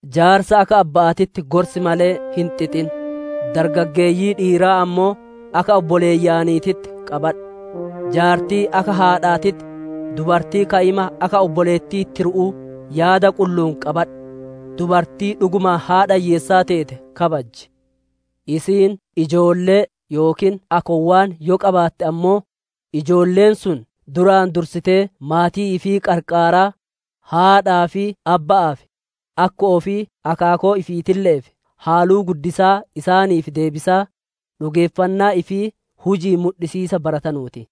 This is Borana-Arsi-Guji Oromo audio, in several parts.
Jaarsa akka abba'aatitti gorsi malee hin xixin; dargaggageeyyii dhiiraa ammoo akka obboleeyyaniititti qabadhu; jaartii akka haadhaatitti, dubartii ka'ima akka obboleettii tiru'uu yaada qullu'uun qabadhu. Dubartii dhugumaan haadha hiyyeessaa teete kabaji. Isiin ijoollee yookiin akkoowwan yoo qabaatte ammoo, ijoolleen sun duraan dursitee maatii ifii qarqaaraa, haadhaa fi abba'aaf, akko'oo fi akaakoo ifiitille'eef haluu guddisaa isaaniif deebisaa, dhugeeffannaa ifii huji'iin mudhisiisa baratanuu ti.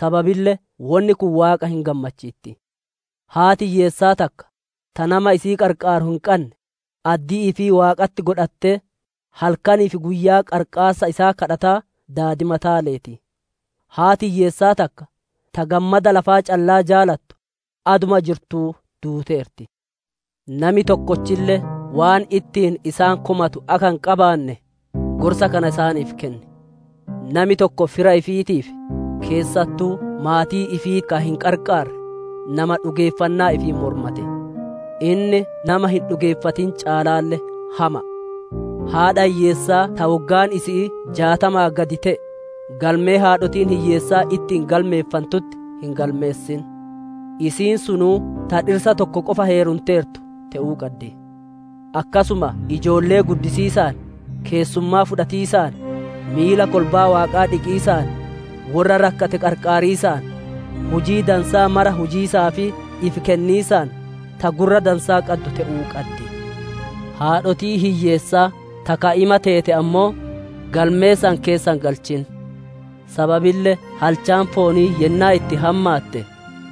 Sababille wonni kun Waaqa hin gammachiitti. Haati hiyyeessaa takka, ta nama isii qarqaaru hin qanne, addii ifii Waaqatti godhatee halkanii fi guyyaa qarqaarsa isaa gaafataa daadimataa leeti. Haati hiyyeessaa takka ta gammada lafaa callaa jaalattu, aduma jirtuu duuteerti. Nami tokkolle waan ittiin isaan komatu akka hin qabaanne, gorsa kana isaaniif kenni. Nami tokko fira ifiitiif, keessattuu maatii ifiitii ka hin qarqaarre, nama dhugeeffannaa ifii mormate; inni nama hin dhugeeffatin caalaalle hama'a. Haadha hiyyeessaa ta woggaan isi'ii jaatamaa gadi te'e, galmee haadhotiin hiyyeessaa itti galmeeffantutti hin galmeessin. Isiin sunuu ta dhirsa tokko qofa heerumteertu te'uu qaddi. Akkasuma ijoollee guddisiisaan, keessummaa fudhatiisaan, miila kolbaa Waaqaa dhiqiisaan, worra rakkate qarqaariisaan, hujii dansaa mara hujiisaa fi ifi kenniisaan ta gurra dansaa qaddu te'uu qaddi. Haadhotii hiyyeessaa ta ka'ima teete ammoo, galmee san keessa hin galchin; sababille halchaan foonii yennaa itti hammaatte,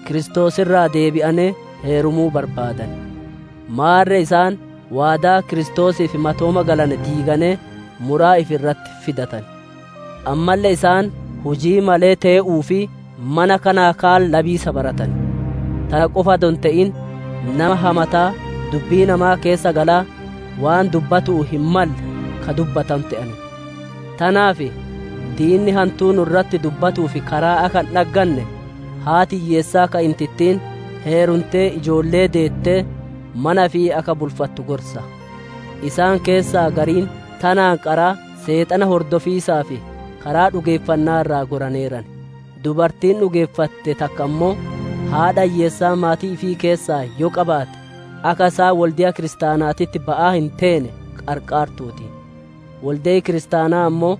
Kiristoos irraa deebi'anee heerumuu barbaaddan. Maarre isaan waadaa Kiristoosiif matooma galane diiganee muraa ifi irratti fidatan. Ammalle isaan hujii malee tee'uu fi mana kanaa kaan labiisa baratan; tana qofa adoo hin te'in, nama hamataa dubbii namaa keessa galaa, waan dubbatu'uu hin malle ka dubbatanu te'an. Tanaaf diinni hantuu nu'u irratti dubbatuuf karaa akka hin dhagganne, haati hiyyeessaa ka'intittiin heerumtee ijoollee deettee, mana ifii akka bulfattu gorsa. Isaan keessaa gariin tanaan qaraa Seexana hordofiisaaf karaa dhugeeffanna'aa irraa goraneeran. Dubartiin dhugeeffatte takka ammoo, haadha hiyyeessaa maatii ifii keessaa yoo qabaatte, akka isaan wolde'a Kiristaanaatitti ba'aa hin teene qarqaartuuti; wolde'i Kiristaanaa ammoo,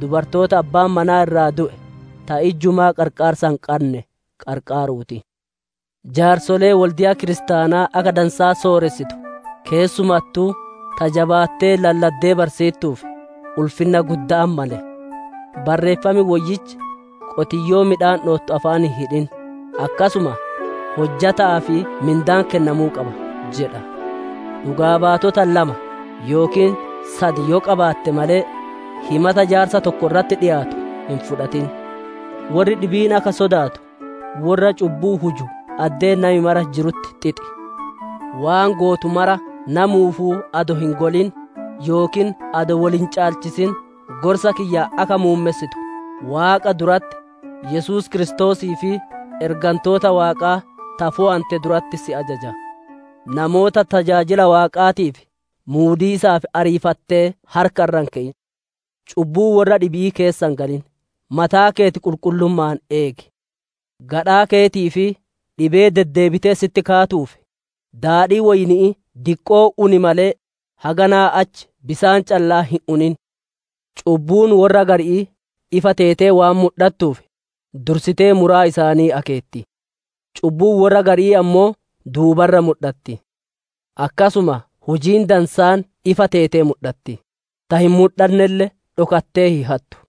dubartoota abbaan manaa irraa du'e, ta ijjumaa qarqaarsa hin qanne qarqaaruu ti. Jaarsolee wolde'a kiristaanaa akka dansaa sooressitu, keessumattuu ta jabaattee lalladdee barsiittuuf, ulfinna gudda'atti male. Barreeffam Woyyichi, «Qotiyyoo midhaan dhowiisatti jirtu afaan hin hidhin», akkasuma, «Hojjata'aaf mindaan kennamuu qaba» jedha. Dhugaa baatota lama yookiin sad yoo qabaate malee, himata jaarsa tokko irratti dhiyaatu hin fudhatin. Worri dhibiin akka sodaatu, worra cubbuu huju addee nami mara jirutti xixi. Waan gootu mara namuufuu adoo hin golin, yookiin adoo wol hin caalchisin gorsa kiyya akka muummessitu Waaqa duratti, Yesuus Kiristoosii fi ergantoota Waaqaa ta fooyante duratti si ajaja. Namoota tajaajila Waaqaatiif muudiisaaf ariifattee harka irra hin keyin. Cubbuu worra dhibi'ii keessa hin galin; mataa keeti qulqullumma'aan eegi. Gadhaa keetii fi dhibee deddeebitee sitti kaatuuf, daadhii woyni'ii diqqoo uni malee haganaa achi bisaan callaa hin unin. Cubbuun worra gari'ii ifa teete waan mudhattuuf, dursitee muraa isaanii akeetti; cubbuun worra gari'ii ammoo duuba irra mudhatti. Akkasuma hujiin dansaan ifa teetee mudhatti, ta hin mudhannelle dhokattee hin hattu.